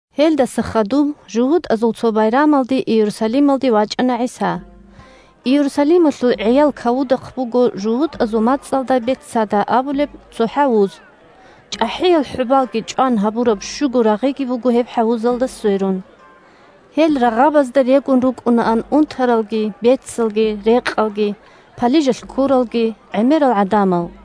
Гьелдаса хадуб жугьутӀазул цо байрамалде Иерусалималде вачӀана ГӀиса. Иерусалималъул «ГӀиял кавудахъ» буго жугьутӀазул мацӀалда Бетцата абулеб цо хӀавуз. ЧӀахӀиял хӀубалги чӀван гьабураб щуго рагъиги буго гьеб хӀавузалда сверун. Гьел рагъабазда регун рукӀунаан унтаралги, бецалги, рекъалги, палижалъ ккуралги гӀемерал гӀадамал.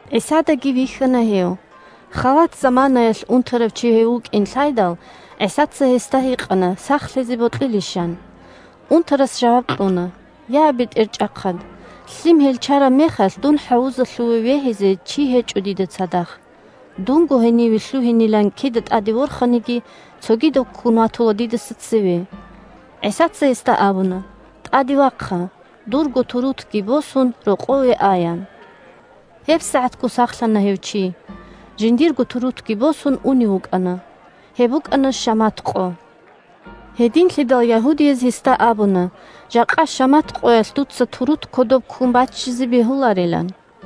ГӀисадаги вихьана гьев. Халат заманаялъ унтарав чи гьев вукӀин лъайдал, ГӀисаца гьесда гьикъана сахлъизе бокьилищилан. Унтарас жаваб кьуна: – Я, бетӀерчӀахъад! Лъим гьелчараб мехалъ, дун хӀавузалъуве вегьизе чи гьечӀо дида цадахъ. Дунго гьениве лъугьинилан кида тӀаде ворханиги, цогидав ккун ватула дидаса цеве. ГӀисаца гьесда абуна: – ТӀаде вахъа! Дурго турутги босун, рокъове а, – ян. ГьебсагӀатго сахлъана гьев чи. Жиндирго турутги босун унев вукӀана. Гьеб букӀана шамат къо. Гьединлъидал ягьудияз гьесда абуна жакъа шамат къоялъ дуца турут кодоб ккун баччизе бегьуларилан.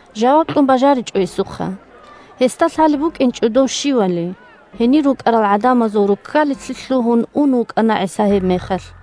жаваб кьун бажаричӀо гьесухъа. Гьесда лъалеб букӀинчӀо дов щивали. Гьенир рукӀарал гӀадамазул руккалилъе лъугьун ун вукӀана ГӀиса гьебмехалъ.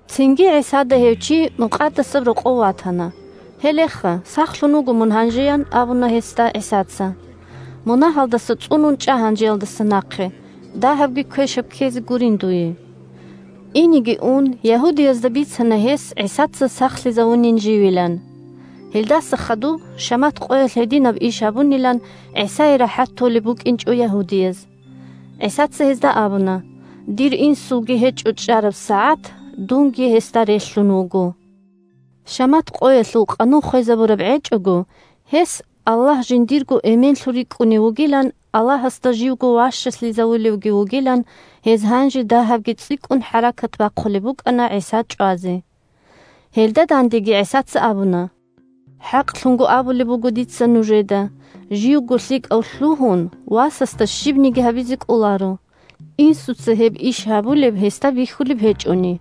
Цинги ГӀисада гьев чи Мукъадасаб Рокъов ватана. – Гьелеха, сахлъун вуго мун гьанже, – ян абуна гьесда ГӀисаца. – Мунагьалдаса цӀунун чӀа гьанжеялдаса нахъе, дагьабги квешаб ккезе гурин дуе. Инеги ун ягьудиязда бицана гьес ГӀисаца сахлъизавунин живилан. Гьелдаса хадуб, шамат къоялъ гьединаб иш гьабунилан, ГӀисае рахӀат толеб букӀинчӀо ягьудияз. ГӀисаца гьезда абуна: – Дир Инсулги гьечӀо чӀараб сагӀат, дунги гьесда релълъун вуго. Шамат къоялъул къанун хвезабураб гӀечӀого, гьес Аллагь жиндирго эменлъун рикӀкӀунев вугилан, Аллагьасда живго ващалъизавулевги вугилан, гьез гьанже дагьабги цӀикӀкӀун хӀаракат бахъулеб букӀана ГӀиса чӀвазе. Гьелда дандеги ГӀисаца абуна: – ХӀакълъун абулеб буго дица нужеда: живго лъикӀав лъугьун Васасда щибниги гьабизе кӀоларо, Инсуца гьеб иш гьабулеб гьесда бихьулеб гьечӀони.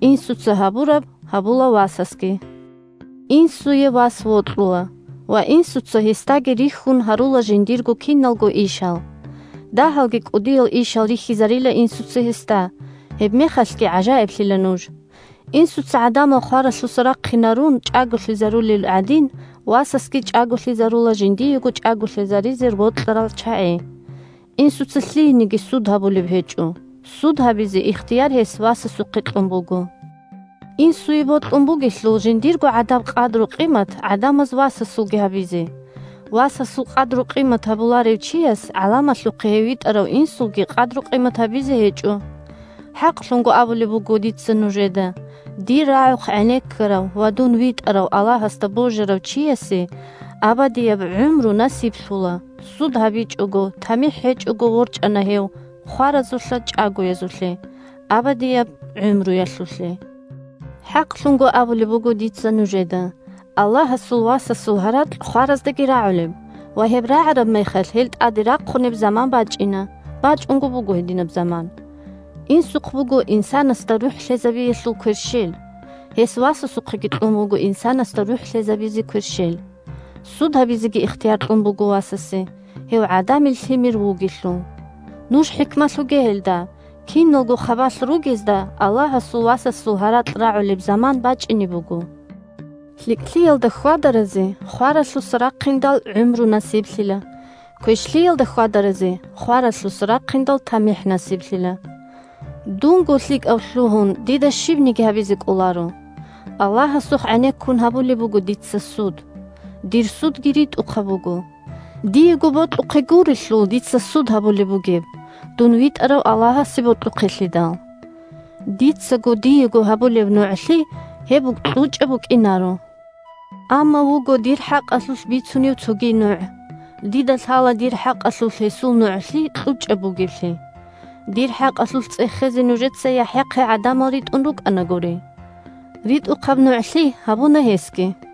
Инсуца гьабураб гьабула Васасги. Инсуе вас вокьула, ва Инсуца гьесдаги рихьун гьарула жиндирго киналго ишал. Дагьалги кӀудиял ишал рихьизарила Инсуца гьесда, гьебмехалъги гӀажаиблъила нуж. Инсуца гӀадамал хваралъуса рахъинарун, чӀаголъизарулел гӀадин, Васасги чӀаголъизарула жиндиего чӀаголъизаризе бокьарал чагӀи. Инсуца лъиениги суд гьабулеб гьечӀо, суд гьабизе ихтияр гьес Васасухъе кьун буго. Инсуе бокьун бугелъул Жиндирго гӀадаб къадру-къимат гӀадамаз васасулги гьабизе. Васасул къадру-къимат гьабуларев чияс гӀаламалъухъе гьев витӀарав Инсулги къадру-къимат гьабизе гьечӀо. ХӀакълъун абулеб буго дица нужеда: дир рагӀухъ гӀенеккарав ва дун витӀарав Аллагьасда божарав чиясе абадияб гӀумру насиблъула, суд гьабичӀого, тамихӀ гьечӀого ворчӀана гьев хваразулъа чӀагоязулъе – абадияб гӀумруялъулъе. ХӀакълъун абулеб буго дица нужеда: Аллагьасул Васасул гьаракь хвараздаги рагӀулеб ва гьеб рагӀараб мехалъ гьел тӀаде рахъунеб заман бачӀина, бачӀунго буго гьединаб заман. Инсухъ буго инсанасда рухӀ лъезабиялъул кверщел. Гьес Васасухъеги кьун буго инсанасда рухӀ лъезабизе кверщел. Суд гьабизеги ихтияр кьун буго Васасе – гьев ГӀадамил Лъимер вугелъул. Нуж хӀикмалъуге гьелда, киналго хабалъ ругезда Аллагьасул Васасул гьаракь рагӀулеб заман бачӀине буго: лъикӀлъиялда хьвадаразе, хваралъуса рахъиндал, гӀумру насиблъила, квешлъиялда хьвадаразе, хваралъуса рахъиндал, тамихӀ насиблъила. Дунго лъикӀав лъугьун дида щибниги гьабизе кӀоларо. Аллагьасухъ гӀенеккун гьабулеб буго дица суд. Дир судги ритӀухъаб буго, – диего бокьухъе гурелъул дица суд гьабулеб бугеб, дун витӀарав Аллагьасе бокьухъелъидал. Дицаго диего гьабулеб нугӀлъи – гьеб кьучӀаб букӀинаро. Амма вуго дир хӀакъалъулъ бицунев цоги НугӀ. Дида лъала дир хӀакъалъулъ Гьесул нугӀлъи кьучӀаб бугеблъи. Дир хӀакъалъулъ цӀехезе нужеца ЯхӀяхъе гӀадамал ритӀун рукӀанагури. РитӀухъаб нугӀлъи гьабуна гьесги.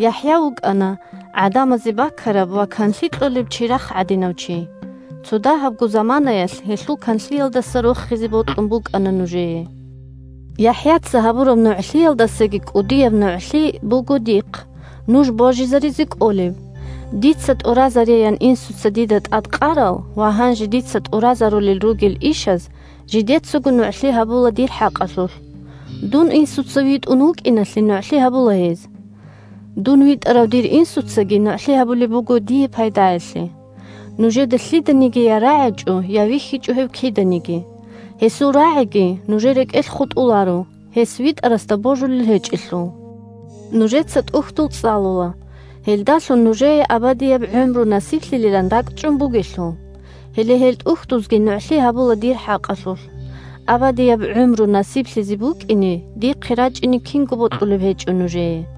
ЯхӀя вукӀана гӀадамазе бакараб ва канлъи кьолеб чирахъ гӀадинав чи. Цо дагьабго заманаялъ гьелъул канлъиялдаса рохизе бокьун букӀана нужее. ЯхӀяца гьабураб нугӀлъиялдасаги кӀудияб нугӀлъи буго дихъ, нуж божизаризе кӀолеб. Дица тӀуразареян Инсуца дида тӀадкъарал ва гьанже дица тӀуразарулел ругел ишаз жидецаго нугӀлъи гьабула дир хӀакъалъулъ. Дун Инсуца витӀун вукӀиналъе нугӀлъи гьабула гьез. Дун витӀарав дир Инсуцаги нугӀлъи гьабулеб буго дие пайдаялъе. Нужеда лъиданиги я рагӀичӀо, я вихьичӀо гьев киданиги. Гьесул рагӀиги нужер рекӀелъ хутӀуларо, гьес витӀарасда божулел гьечӀелъул. Нужеца ТӀухьдул цӀалула, гьелдалъун нужее абадияб гӀумру насиблъилилан ракӀчӀун бугелъул. Гьеле гьел ТӀухьдузги нугӀлъи гьабула дир хӀакъалъулъ. Абадияб гӀумру насиблъизе букӀине дихъе рачӀине кинго бокьулеб гьечӀо нужее.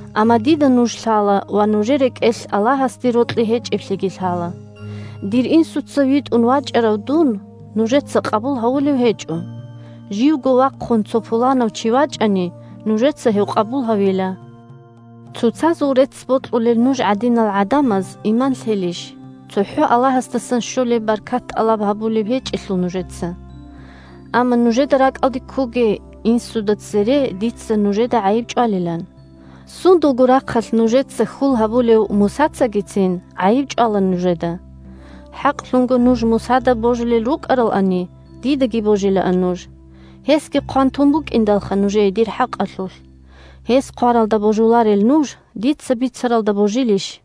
Амма дида нуж лъала ва нужер рекӀелъ Аллагьасде рокьи гьечӀеблъиги лъала. Дир Инсуца витӀун вачӀарав дун нужеца къабул гьавулев гьечӀо. Живго вахъун цо пуланав чи вачӀани, нужеца гьев къабул гьавила. Цоцазул рецц бокьулел нуж гӀадинал гӀадамаз иман лъелищ, цохӀо Аллагьасдасан щолеб баркат тӀалаб гьабулеб гьечӀелъул нужеца. Амма нужеда ракӀалде ккоге Инсуда цере дица нужеда гӀайиб чӀвалилан. Сундулго рахъалъ нужеца хьул гьабулев Мусацагицин гӀайиб чӀвала нужеда. ХӀакълъун нуж Мусада божулел рукӀаралани, дидаги божилаан нуж. Гьесги хъван тун букӀиндалха нужее дир хӀакъалъулъ. Гьес хъваралда божуларел нуж, дица бицаралда божилищ?